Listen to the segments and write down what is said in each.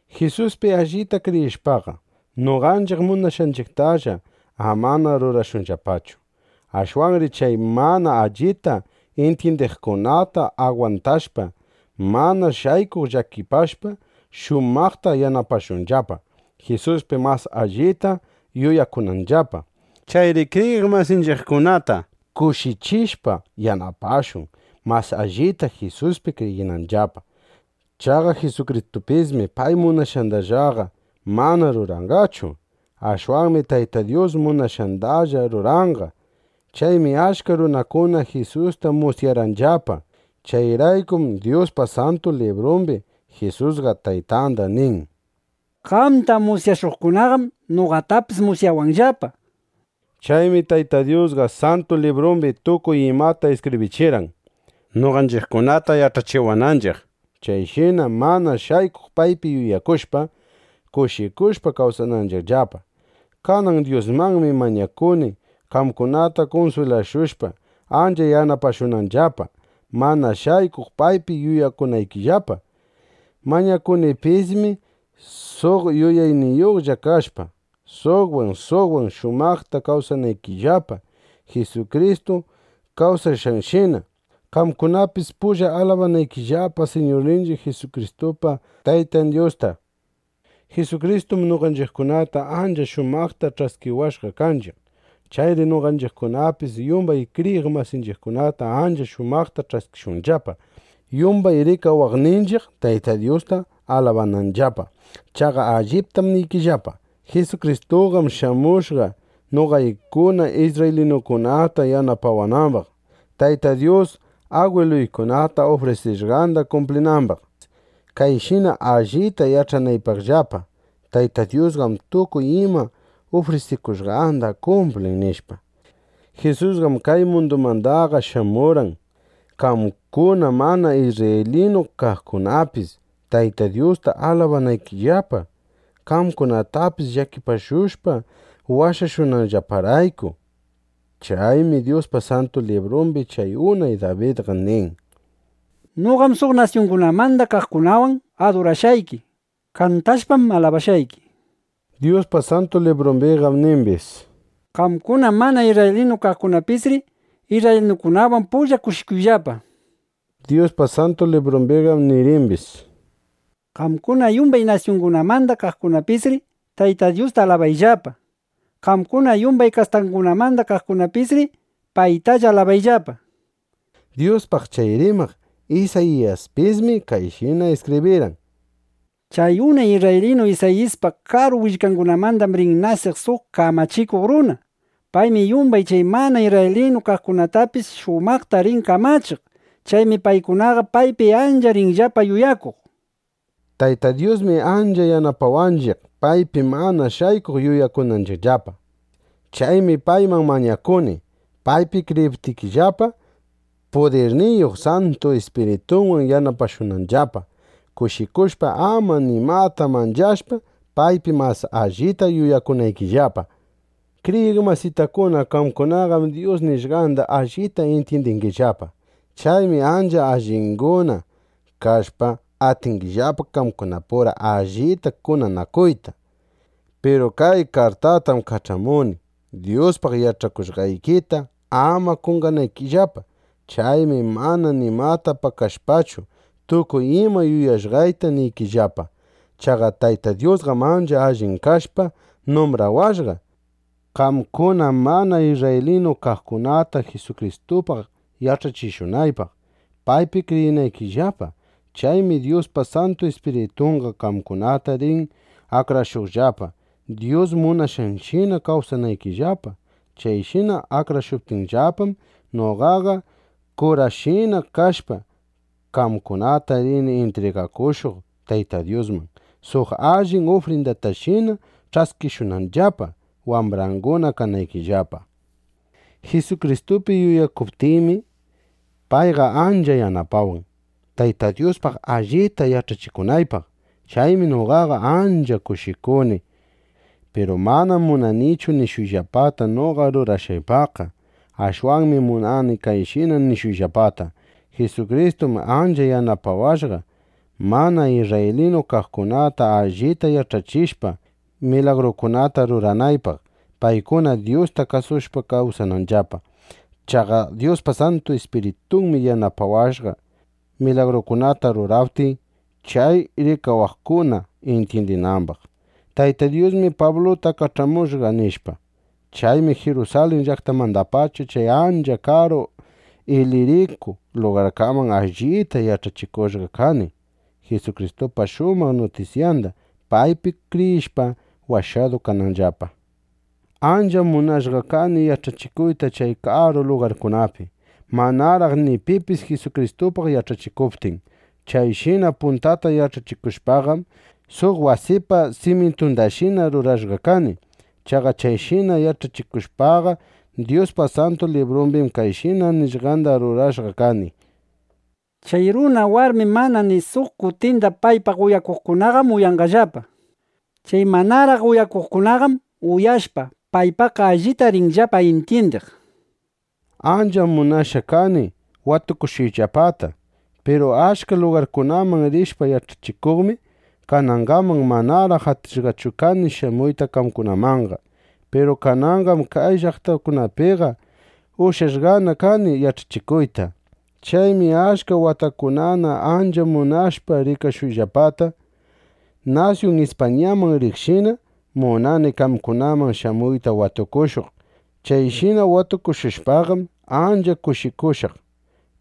Jisuspi allita kriyishpaqa, noqanchiq munashqanchiqtallaqa amana rurashunllapachu. Ashwanri chay mana allita intyindiqkunata agwantashpa, mana shaykuq llakipashpa, shumaqta yanapashunllapa, Jisuspi mas allita yuyakunanllapa. Chayri kriyiq masinchiqkunata kushichishpa, yanapashun, mas allita Jisuspi kriyinanllapa. Chaqa Jisukristupismi pay munashqandallaqa mana rurarqanchu. Ashwanmi Tayta Dyus munashqandalla rurarqanqa. Chaymi achka runakuna Jisusta musyarqanllapa. Chayraykum Dyuspa Santu Librumbi Jisusqa Taytanda nin: “Qamta musyashuqkunaqam noqatapis musyawanllapa”, nishpa. Chaymi Tayta Dyusqa Santu Librumbi tukuy imata iskibrichirqan, noqanchiqkunata yach'achiwananchiq, chayshina mana shaykuq paypi yuyakushpa, kushikushpa kawsananchiqllapa. Kanan Dyusmanmi mañakuni, qamkunata kunswilashushpa, ancha yanapashunanllapa, mana shaykuq paypi yuyakunaykillapa. Mañakunipismi suq yuyayniyuqlla kashpa, suqwan suqwan shumaqta kawsanaykillapa, Jisukristu kawsashqanshina, qamkunapis pulla alabanaykillapa Siñurninchiq Jisukristupa Tayta Dyusta. Jisukristum noqanchiqkunata ancha shumaqta ch'askiwashqa kanchiq. Chayri noqanchiqkunapis yumbay kriyiq masinchiqkunata ancha shumaqta ch'askishunllapa, yumbay rikawaqninchiq Tayta Dyusta alabananllapa. Chaqa alliptam niykillapa: Jisukristuqam shamushqa, noqaykuna isrraylinukunata yanapawanambaq, Tayta Dyus agwiluykunata ufrisishqanda kumplinambaq, kayshina allita yach'anaypaqllapa: Tayta Dyusqam tukuy ima ufrisikushqanda kumplin, nishpa. Jisusqam kay mundumanqa shamurqan, qamkuna mana isrraylinu kaqkunapis Tayta Dyusta alabanaykillapa, qamkunatapis llakipashushpa, washashushqanllaparayku. Chaymi Dyuspa Santu Librumbi chay unay Dabidqa nin: Noqam suq nasyungunamanda kaqkunawan adurashqayki. Kantashpam, alabashqayki, nishpa. Dyuspa Santu Librumbiqam nimbis: Qamkuna mana isrraylinu kaqkunapisri isrraylinukunawan pulla kushikuyllapa, nishpa. Dyuspa Santu Librumbiqam nirimbis: “Qamkuna yumbay nasyungunamanda kaqkunapisri Tayta Dyusta alabayllapa. Qamkuna yumbay kastakunamanda kaqkunapisri paytalla alabayllapa”, nishpa. Dyuspaq chay rimaq Isayiyaspismi kayshina iskibrirqan: Chay unay isrraylinu Isayipa karu willkangunamandam rin nasiq suq kamachikuq runa. Paymi yumbay chay mana isrraylinu kaqkunatapis shumaqta rin kamachiq. Chaymi paykunaqa paypi ancha rinllapa yuyakuq, nishpa. Tayta Dyusmi ancha yanapawanchiq, paypi mana shaykuq yuyakunanchiqllapa. Chaymi payman mañakuni, paypi kriyiptikillapa, pudirniyuq Santu Ispiritunwan yanapashunanllapa, kushikushpa, ama nimata manchashpa, paypi mas allita yuyakunaykillapa. Kriyiq masitakuna, qamkunaqam Dyus nishqanda allita intyindingillapa. Chaymi ancha allinguna kashpa, atingillapa qamkunapura allita kunanakuyta. Piru kay kartatam kach'amuni, Dyuspaq yach'akushqaykita ama qonqanaykillapa. Chaymi mana nimata pakashpachu, tukuy ima yuyashqayta niykillapa. Chaqa Tayta Dyusqam ancha allin kashpa, numbrawashqa, qamkuna mana isrraylinu kaqkunata Jisukristupaq yach'achishunaypaq, paypi kriyinaykillapa. Chaymi Dyuspa Santu Ispiritunqa qamkunata rin akrashuqllapa, Dyus munashqanshina kawsanaykillapa. Chayshina akrashuptinllapam, noqaqa kurashina kashpa, qamkunata rini intrigakushuq Tayta Dyusman, suq allin ufrindatashina ch'askishunanllapa, wambranguna kanaykillapa. Jisukristupi yuyakuptiymi, payqa ancha yanapawan, Tayta Dyuspaq allita yach'achikunaypaq. Chaymi noqaqa ancha kushikuni. Piru manam munanichu nishuyllapata noqa rurashqaypaqqa. Ashwanmi munani kayshina nishuyllapata: Jisukristum ancha yanapawashqa, mana isrraylinu kaqkunata allita yach'achishpa, milagrukunata ruranaypaq, paykuna Dyusta kasushpa kawsananllapa. Chaqa Dyuspa Santu Ispiritunmi yanapawashqa, milagrukunata ruraptiy, chay rikawaqkuna intyindinambaq: Tayta Dyusmi Pabluta kach'amushqa, nishpa. Chaymi Jirusalin llaqtamandapacha chay ancha karu Iliriku lugarkaman allita yach'achikushqa kani Jisukristupa shumaq nutisyanda, paypi kriyishpa, washadu kananllapa. Ancham munashqa kani yach'achikuyta chay karu lugarkunapi, manaraq ni pipis Jisukristupaq yach'achikuptin. Chayshina puntata yach'achikushpaqam, suq wasipa simyintundashina rurashqa kani. Chaqa chayshina yach'achikushpaqa, Dyuspa Santu Librun kayshina nishqanda rurashqa kani: Chay runa, warmi mana ni suq kutinda paypaq uyaqkunaqam uyanqallapa. Chay manaraq uyaqkunaqam uyashpa, paypaqqa allita rinllapa intyindiq, nishpa. Ancham munashqa kani watukushuyllapata. Piru achka llaqtakunaman rishpa yach'achikuqmi, kanangaman manaraq atishqachu kani shamuyta qamkunamanqa. Piru kananqam kay llaqtakunapiqa ushyashqana kani yach'achikuyta. Chaymi achka watakunana ancha munashpa rikashuyllapata, nasyun Ispañaman riqshina, munani qamkunaman shamuyta watukushuq. Chayshina watukushushpaqam, ancha kushikushaq.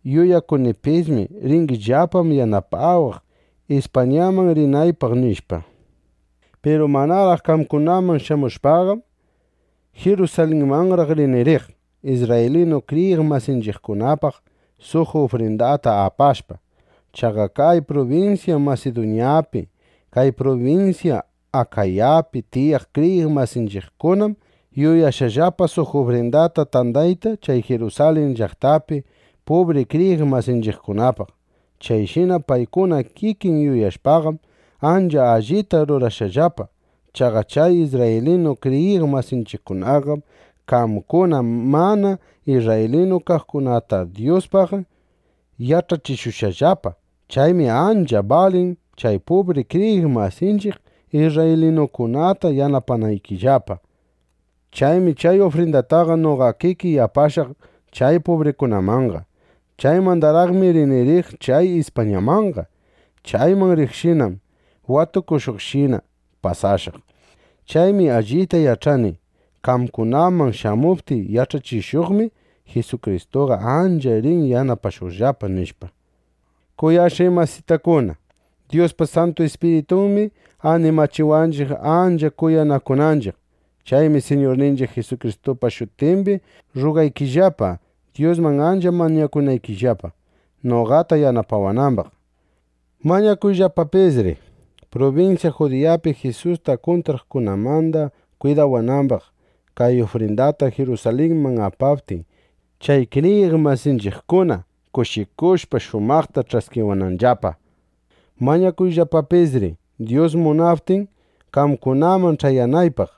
Yuyakunipismi: Ringillapam yanapawaq, Ispañaman rinaypaq, nishpa. Piru manaraq qamkunaman shamushpaqam, Jirusalinmanraq rini riq, isrraylinu kriyiq masinchiqkunapaq suq ufrindata apashpa. Chaqa kay prubinsya Masiduñapi, kay prubinsya Akayapi tiyaq kriyiq masinchiqkunam yuyashqallapa suq ufrindata tandayta chay Jirusalin llaqtapi pubri kriyiq masinchiqkunapaq. Chayshina paykuna kikin yuyashpaqam, ancha allita rurashqallapa. Chaqa chay isrraylinu kriyiq masinchiqkunaqam qamkuna mana isrraylinu kaqkunata Dyuspaq yach'achishushqallapa. Chaymi ancha balin, chay pubri kriyiq masinchiq isrraylinukunata yanapanaykillapa. Chaymi chay ufrindataqa noqa kikiy apashaq chay pubrikunamanqa. Chaymandaraqmi rini riq chay Ispañamanqa. Chayman riqshinam watukushuqshina pasashaq. Chaymi allita yach'ani: Qamkunaman shamuptiy yach'achishuqmi, Jisukristuqa ancha rin yanapashuqllapa, nishpa. Kuyashqay masitakuna, Dyuspa Santu Ispiritunmi animachiwanchiq, ancha kuyanakunanchiq. Chaymi Siñurninchiq Jisukristupa shutimbi rrugaykillapa, Dyusman ancha mañakunaykillapa, noqata yanapawanambaq. Mañakuyllapapisri, prubinsya Judiyapi Jisusta kuntraqkunamanda kwidawanambaq, kay ufrindata Jirusalinman apaptiy, chay kriyiq masinchiqkuna kushikushpa, shumaqta ch'askiwananllapa. Mañakuyllapapisri, Dyus munaptin, qamkunaman ch'ayanaypaq,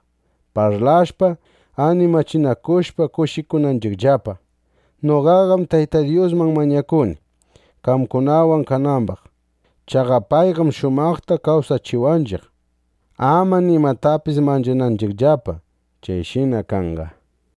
parlashpa, animachinakushpa, kushikunanchiqllapa. Noqaqam Tayta Dyusman mañakuni, qamkunawan kanambaq. Chaqa payqam shumaqta kawsachiwanchiq, ama nimatapis manchananchiqllapa. Chayshina kanqa.